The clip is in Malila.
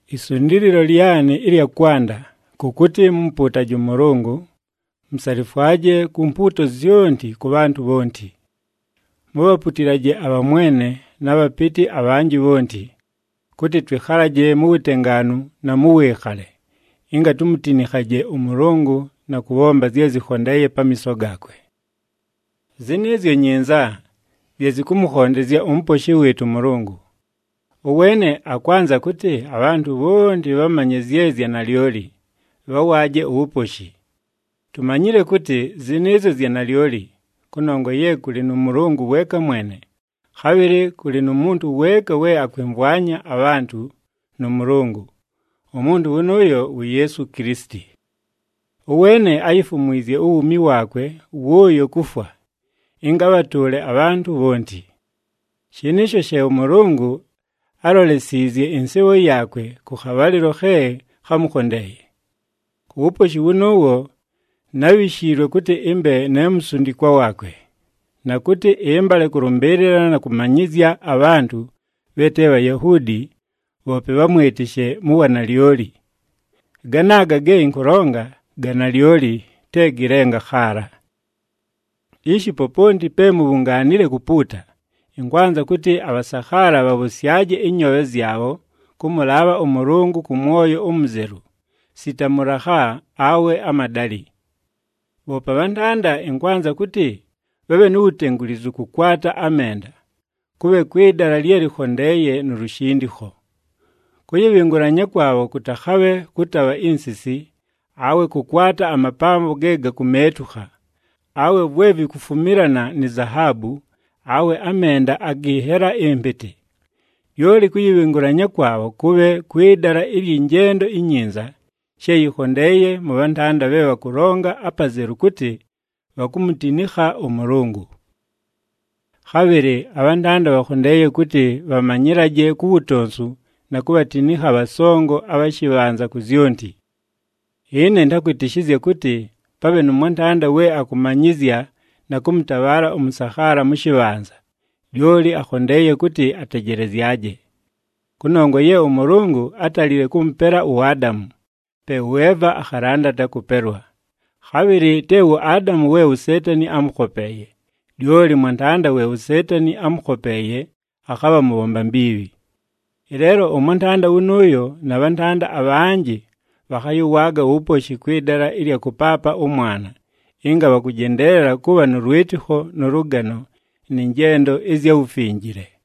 Isundiililo lyanɨ ɨlya kwanda, kʉ kʉtɨ mumupuutaje ʉMʉlʉngʉ, musalifwaje ku mpuuto zyonti kʉ bhantʉ bhonti. Mubhaputilaje abhamwene, na bhapɨtɨ abhanjɨ bhonti, kʉtɨ twɨkhalaje mu wutengaanu na mʉ wɨɨkhale, ɨnga tumutinikhaje ʉMʉlʉngʉ na kʉbhomba zye zɨkhondeeye pamiiso gaakwe. Zɨnɨɨzyo nyinza, zye zɨkʉmʉkhondezya uMuposhi wɨɨtʉ ʉMʉlʉngʉ. Ʉweene akwanza kʉtɨ, abhantʉ bhonti bhamanye zye zya nalyoli, bhawaaje uwuposhi. Tumanyile kʉtɨ, zɨnɨɨzyo zya nalyoli, kʉnongwa ye kʉlɨ nʉ Mʉlʉngʉ weeka mwene, khabhɨlɨ kʉlɨ nu muntu weeka we akwɨmvwanya abhantʉ nʉ Mʉlʉngʉ, umuntu wʉnʉʉyo wu Yeesu Kilisiti. Ʉweene áyifumwizye uwuumi waakwe wʉʉyo kufwa, ɨnga abhatʉʉle abhantʉ bhonti. Shɨnɨɨsho she ʉMʉlʉngʉ álolesiizye ɨnsɨɨbho yaakwe kʉ khabhalɨlo khe khámukhondeeye. Ku wuposhi wʉnʉʉwo, nábhishiilwe kʉtɨ ɨmbe ne musundikwa waakwe, na kʉtɨ ɨmbale kʉlʉmbɨɨlɨla na kʉmanyɨzya abhantʉ bhe te Bhayahuudi bhoope bhamwɨtɨshe mu wanalyoli. Ganaaga ge ɨnkʉlonga ga nalyoli, te gɨ lenga khaala! Ishi, poponti pe mubhungaanile kupuuta, ɨnkwanza kʉtɨ abhasakhaala bhabhʉsyaje ɨnyoobhe zyabho kʉmʉlaabha ʉMʉlʉngʉ kʉ mwoyo umuzelu, sita mʉlakha, awe amadalɨ. Bhoope abhantanda, ɨnkwanza kʉtɨ, bhabhe nu wutengulizu kʉkwata amenda, kʉbhe kwɨ dala lye lɨkhondeeye nu lushindikho. Kʉyɨbhɨngʉlanya kwabho kʉtakhabhe kʉtabha insisi, awe kʉkwata amapambo ge gakumeetukha, awe vwe vikufumilana ni zahaabu, awe amenda agɨ nhela ɨmpɨtɨ. Lyoli kʉyɨbhɨngʉlanya kwabho kʉbhe kwɨ dala ɨlyɨ njendo inyinza, she yɨkhondeeye mʉ bhantanda bhe bhakʉlonga apazelu kʉtɨ, bhakumutinikha ʉMʉlʉngʉ. Khabhɨlɨ abhantanda bhakhondeeye kʉtɨ bhamanyɨlaje ku wutonsu na kubhatinikha abhasongo abha shɨbhanza ku zyonti. Ɨne ɨntakwɨtɨshɨzya kʉtɨ, pabhe nʉ mwantanda we akʉmanyɨzya na kʉmʉtabhaala ʉmʉsakhaala mʉ shɨbhanza, lyoli akhondeeye kʉtɨ atejelezyaje. Kʉnongwa ye ʉMʉlʉngʉ átalile kʉmʉpela uAdamu, pe ʉEva akhalandata kʉpelwa. Khabhɨlɨ te wu Adamu we uSeetani ámʉkhopeeye, lyoli mwantanda we uSeetani ámʉkhopeeye akhabha mʉbhomba mbiibhi. Ɨleelo ʉmwantanda wʉnʉʉyo na bhantanda abhanjɨ bhakhayɨwaaga uwuposhi kwɨ dala ɨlya kʉpaapa ʉmwana, ɨnga bhakʉjendeelela kʉbha nʉ lwɨtɨkho nʉ lʉgano, nɨ njendo ɨzya wufinjile.